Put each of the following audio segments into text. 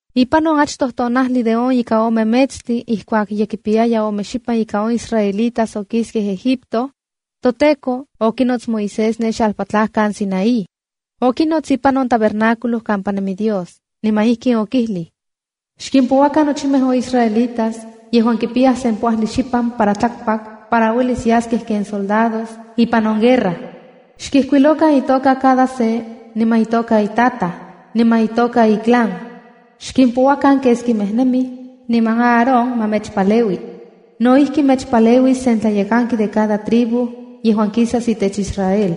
Ipan on achtoj tonajli de on ika ome metstli ijkuak ye kipiyaya ome xipan ika on israelitas okiskej Egipto, toTEKO okinots Moisés ne xalpatlajkan Sinaí. Okinots ipan on tabernáculo kampa nemi Dios, niman okijlij: “Xkimpouakan nochimej on israelitas yejuan ye kipiyaj sempoajli xipan para tlakpak yejuan uelis yaskej ken soldados ipan on guerra. Xkijkuilokan itoka cada se, niman itoka itataj, niman itoka iclan. Xkimpouakan keskimej nemij, niman Aarón ma mechpaleui. No ijki, mechpaleuis sen tlayekanki de cada tribu yejuan kisas itech Israel,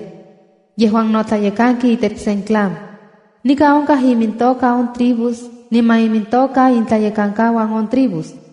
yejuan no tlayekanki itech sen clan.” Nikan onkaj imintoka on tribus niman imintoka intlayekankauan on tribus: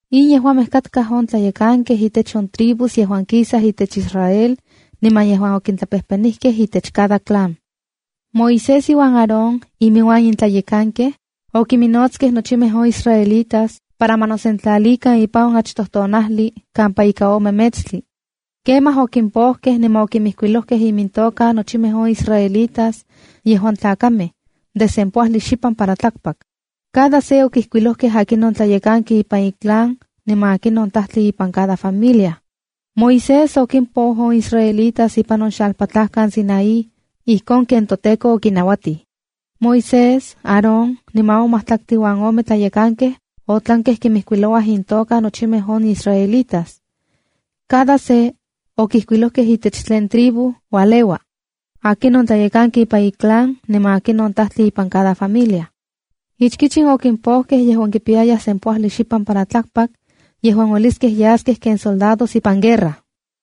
In yejuamej katkaj on tlayekankej intech on tribus yejuan kisaj itech Israel niman yejuan okintlapejpenijkej itech cada clan. Moisés iuan Aarón iminuan in tlayekankej, okiminnotskej nochimej on israelitas para ma nosentlalikan ipan on achtoj tonajli kampa ika ome metstli. Kemaj okimpojkej niman okimijkuilojkej imintoka nochimej on israelitas yejuan tlakamej de sempoajli xipan para tlakpak. Cada se okijkuilojkej akinon tlayekanki ipan iclan niman akinon tajtli ipan cada familia. Moisés okimpou on israelitas ipan on xalpatlajkan Sinaí ijkon ken toTEKO okinauatij. Moisés, Aarón niman on majtlaktli uan ome tlayekankej otlankej kinmijkuilouaj intoka nochimej on israelitas. Cada se okijkuilojkej itech tlen tribu ualeua, akinon tleyekanki ipan iclan, niman akinon tajtli ipan cada familia. Ichkich in okimpojkej yejuan kipiyayaj sempoajli xipan para tlakpak yejuan ueliskej yaskej ken soldados ipan guerra: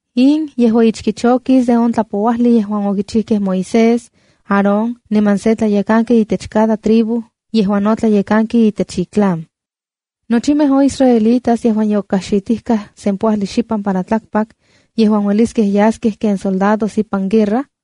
In yejua ichkich okis de on tlapouajli yejuan okichijkej Moisés, Aarón niman se tlayekanki itech cada tribu yejuan no tlayekanki itech iclan. Nochimej on israelitas yejuan yokajxitijkaj sempoajli xipan para tlakpak yejuan ueliskej yaskej ken soldados ipan guerra,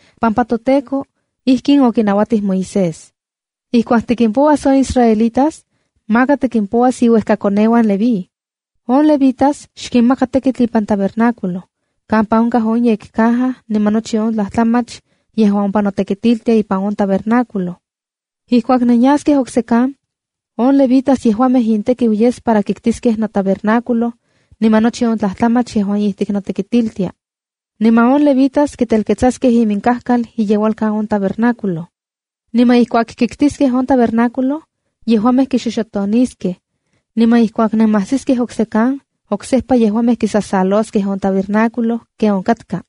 pampa toTEKO ijkin okinauatij Moisés: “Ijkuak tikimpouas on israelitas, maka tikimpouas iuejkakoneuan Leví. On levitas xkinmaka tekitl ipan tabernáculo kampa onkaj on yekcaja, niman nochi on tlajtlamach yejuan ompa notekitiltia ipan on tabernáculo. Ijkuak nenyaskej oksekan, on levitas yejuamej intekiu yes para kiktiskej notabernáculo niman nochi on tlajtlamach yejuan ijtik notekitiltia. Niman on levitas kitelketsaskej iminkajkal iyeualkan on tabernáculo. Niman ijkuak kiktiskej on tabernáculo, yejuamej kixoxotoniskej. Niman ijkuak nemajsiskej oksekan, oksejpa yejuamej kisasaloskej on tabernáculo ken onkatka.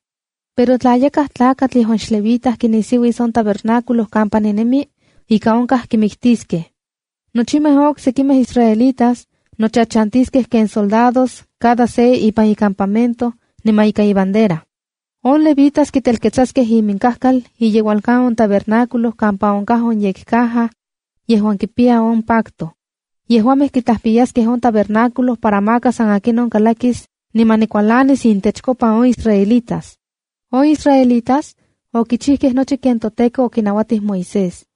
Pero tla yakaj yejuan xlevita kinisiuis on tabernáculo kampa ninemi, ika onkaj kimiktiskej. Nochimej on oksekimej israelitas nochachantiskej ken soldados cada se ipan icampamento, niman ika ibandera. On levitas kitelketsaskej iminkajkal iyeualkan on tabernáculo kampa onkaj on yekcaja yejuan kipiya on pacto. Yejuamej kitlajpiyaskej on tabernáculo para maka san akinon kalakis niman nikualanis intechkopa on israelitas.” On israelitas okichijkej nochi ken toTEKO okinauatij Moisés.